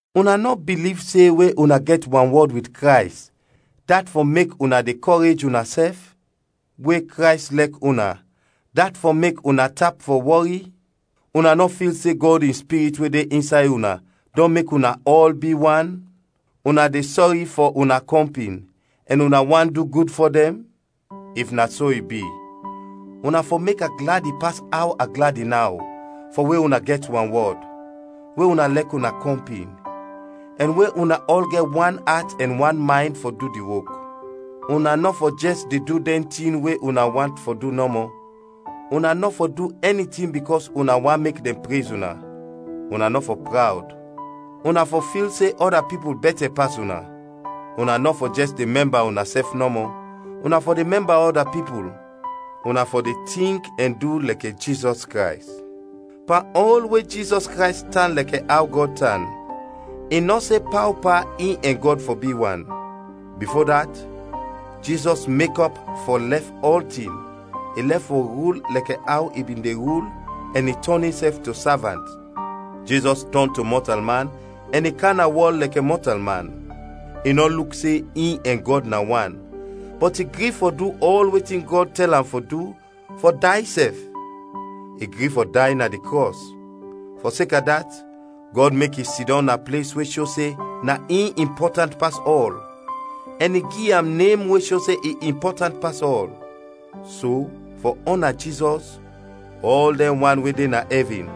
Una nɔ biliv se we una gɛt wanwɔd wit Krays, dat fɔ mek una de kɔrej unasɛf? We Krays lɛk una, dat fɔ mek una tap fɔ wɔri? Una nɔ fil se Gɔd in Spirit we de insay una dɔn mek una ɔl bi wan? Una de sɔri fɔ una kɔmpin ɛn una want du gud fɔ dɛn? If na so i bi, una fɔ mek a gladi pas aw a gladi naw fɔ we una gɛt wanwɔd, we una lɛk una kɔmpin, ɛn we una ɔl gɛt wan at ɛn wan maynd fɔ du di wok. Una nɔ fɔ jɛs de du dɛn tin we una want fɔ du nɔmɔ, una nɔ fɔ du ɛni tin bikɔs una want mek dɛn prez una; una nɔ fɔ prawd, una fɔ fil se ɔda pipul bɛtɛ pas una. Una nɔ fɔ jɛs de mɛmba unasɛf nɔmɔ, una fɔ de mɛmba ɔda pipul. Una fɔ de tink ɛn du lɛkɛ Jizɔs Krays: Pan ɔl we Jizɔs Krays tan lɛkɛ aw Gɔd tan, i nɔ se paopa in ɛn Gɔd fɔ bi wan. Bifo dat, Jizɔs mekɔp fɔ lɛf ɔltin, i lɛf fɔ rul lɛkɛ aw i bin de rul, ɛn i tɔn insɛf to savant. Jizɔs tɔn to mɔtalman ɛn i kam na wɔl lɛkɛ mɔtalman. I nɔ luk se in ɛn Gɔd na wan, bɔt i gri fɔ du ɔl wetin Gɔd tɛl am fɔ du, fɔ day sɛf. I gri fɔ day na di krɔs. Fɔseka dat, Gɔd mek i sidɔm na ples we sho se na in impɔtant pas ɔl ɛn i gi am nem we sho se i impɔtant pas ɔl. So fɔ ɔna Jizɔs, ɔl dɛn wan we de na ɛvin,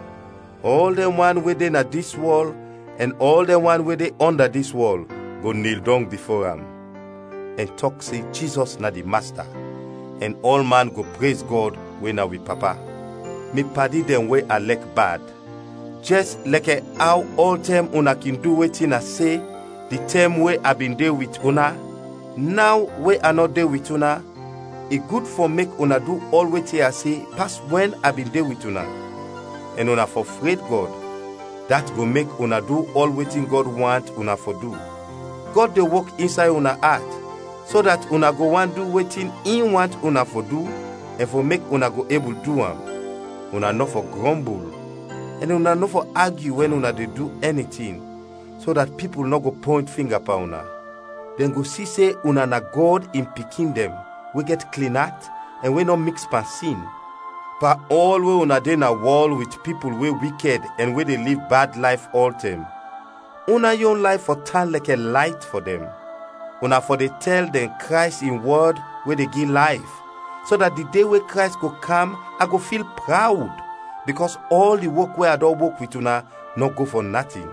ɔl dɛn wan we de na dis wɔl ɛn ɔl dɛn wan we de ɔnda dis wɔl, go nil dɔng bifo am, ɛn tɔk se Jizɔs na di Masta, ɛn ɔlman go prez Gɔd we na wi Papa. Mi padi dɛn we a lɛk bad, jɛs lɛkɛ aw ɔltɛm una kin du wetin a se, di tɛm we a bin de wit una, naw we a nɔ de wit una, i gud fɔ mek una du ɔl wetin a se pas wɛn a bin de wit una; ɛn una fɔ fred Gɔd, dat go mek una du ɔl wetin Gɔd want una fɔ du. Gɔd de wok insay una at so dat una go want du wetin in want una fɔ du ɛn fɔ mek una go ebul du am. Una nɔ fɔ grɔmbul ɛn una nɔ fɔ agyu wɛn una de du ɛni tin, so dat pipul nɔ go pɔynt finga pan una. Dɛn go si se una na Gɔd in pikin dɛn we gɛt klin at ɛn we nɔ miks pan sin. Pan ɔl we una de na wɔl, wit pipul we wikɛd ɛn we de liv bad layf ɔltɛm, una yon layf fɔ tan lɛkɛ layt fɔ dɛn. Una fɔ de tɛl dɛn Krays in wɔd we de gi layf, so dat di de we Krays go kam a go fil prawd, bikɔs ɔl di wok we a dɔn wok wit una nɔ go fɔ natin.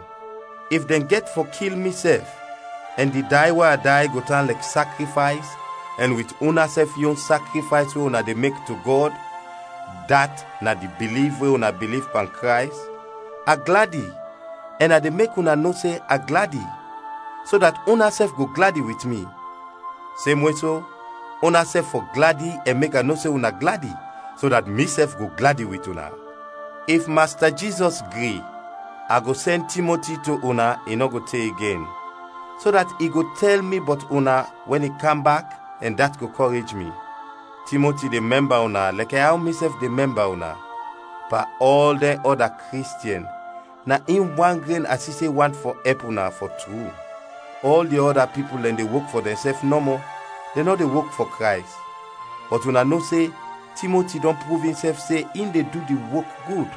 If dɛn gɛt fɔ kil mi sɛf ɛn di day we a day go tan lɛk sakrifays ɛn wit unasɛf yon sakrifays we una de mek to Gɔd dat na di biliv we una biliv pan Krays, a gladi ɛn a de mek una no se a gladi; so dat unasɛf go gladi wit mi. Semwe so, unasɛf fɔ gladi ɛn mek a no se una gladi so dat misɛf go gladi wit una. If Masta Jizɔs gri, a go sɛn Timoti to una, i nɔ go te igen; so dat i go tɛl mi bɔt una wɛn i kam bak ɛn dat go kɔrej mi. Timoti de mɛmba una lɛkɛ aw misɛf de mɛmba una. Pan ɔl dɛn ɔda Kristiɛn, na in wan gren a si se want fɔ ɛp una, fɔ tru. Ɔl di ɔda pipul dɛn de wok fɔ dɛnsɛf nɔmɔ, dɛn nɔ de wok fɔ Krays. Bɔt una no se Timoti dɔn pruv insɛf se in de du di wok gud.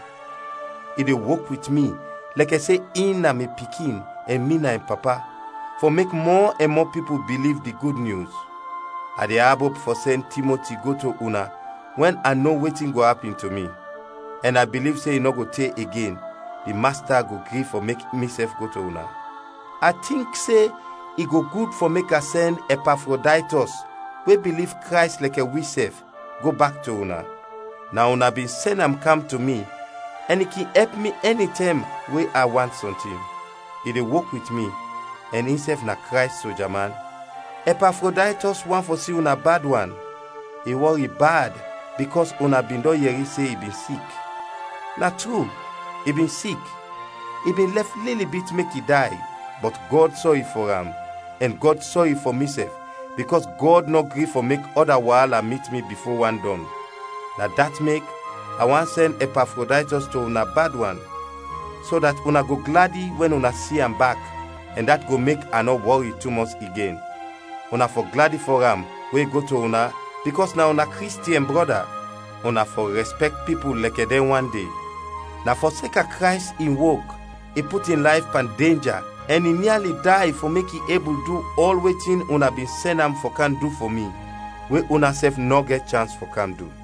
I de wok wit mi, lɛkɛ se in na mi pikin ɛn mi na in papa, fɔ mek mɔ ɛn mɔ pipul biliv di Gud Nyus. A de abop fɔ sɛn Timoti go to una wɛn a no wetin go apin to mi. Ɛn a biliv se i nɔ go te igen, di Masta go gri fɔ mek misɛf go to una. A tink se i go gud fɔ mek a sɛn Ɛpafrodaytɔs, we biliv Krays lɛkɛ wisɛf, go bak to una. Na una bin sɛn am kam to mi ɛn i kin ɛp mi ɛnitɛm we a want sɔntin. I de wok wit mi, ɛn insɛf na Krays soja man. Ɛpafrodaytɔs want fɔ si una bad wan; i wɔri bad bikɔs una bin dɔn yɛri se i bin sik. Na tru, i bin sik, i bin lɛf lili bit mek i day, bɔt Gɔd sɔri fɔ am, ɛn Gɔd sɔri fɔ misɛf bikɔs Gɔd nɔ gri fɔ mek ɔda waala mit mi bifo wan dɔn. Na dat mek a want sɛn Ɛpafrodaytɔs to una bad wan, so dat una go gladi wɛn una si am bak ɛn dat go mek a nɔ wɔri tumɔs igen. Una fɔ gladi fɔ am wɛn i go to una bikɔs na una Kristiɛn brɔda; una fɔ rɛspɛkt pipul lɛkɛ dɛn wan de. Na fɔseka Krays in wok, i put in layf pan denja ɛn i niali day fɔ mek i ebul du ɔl wetin una bin sɛn am fɔ kam du fɔ mi, we unasɛf nɔ gɛt chans fɔ kam du.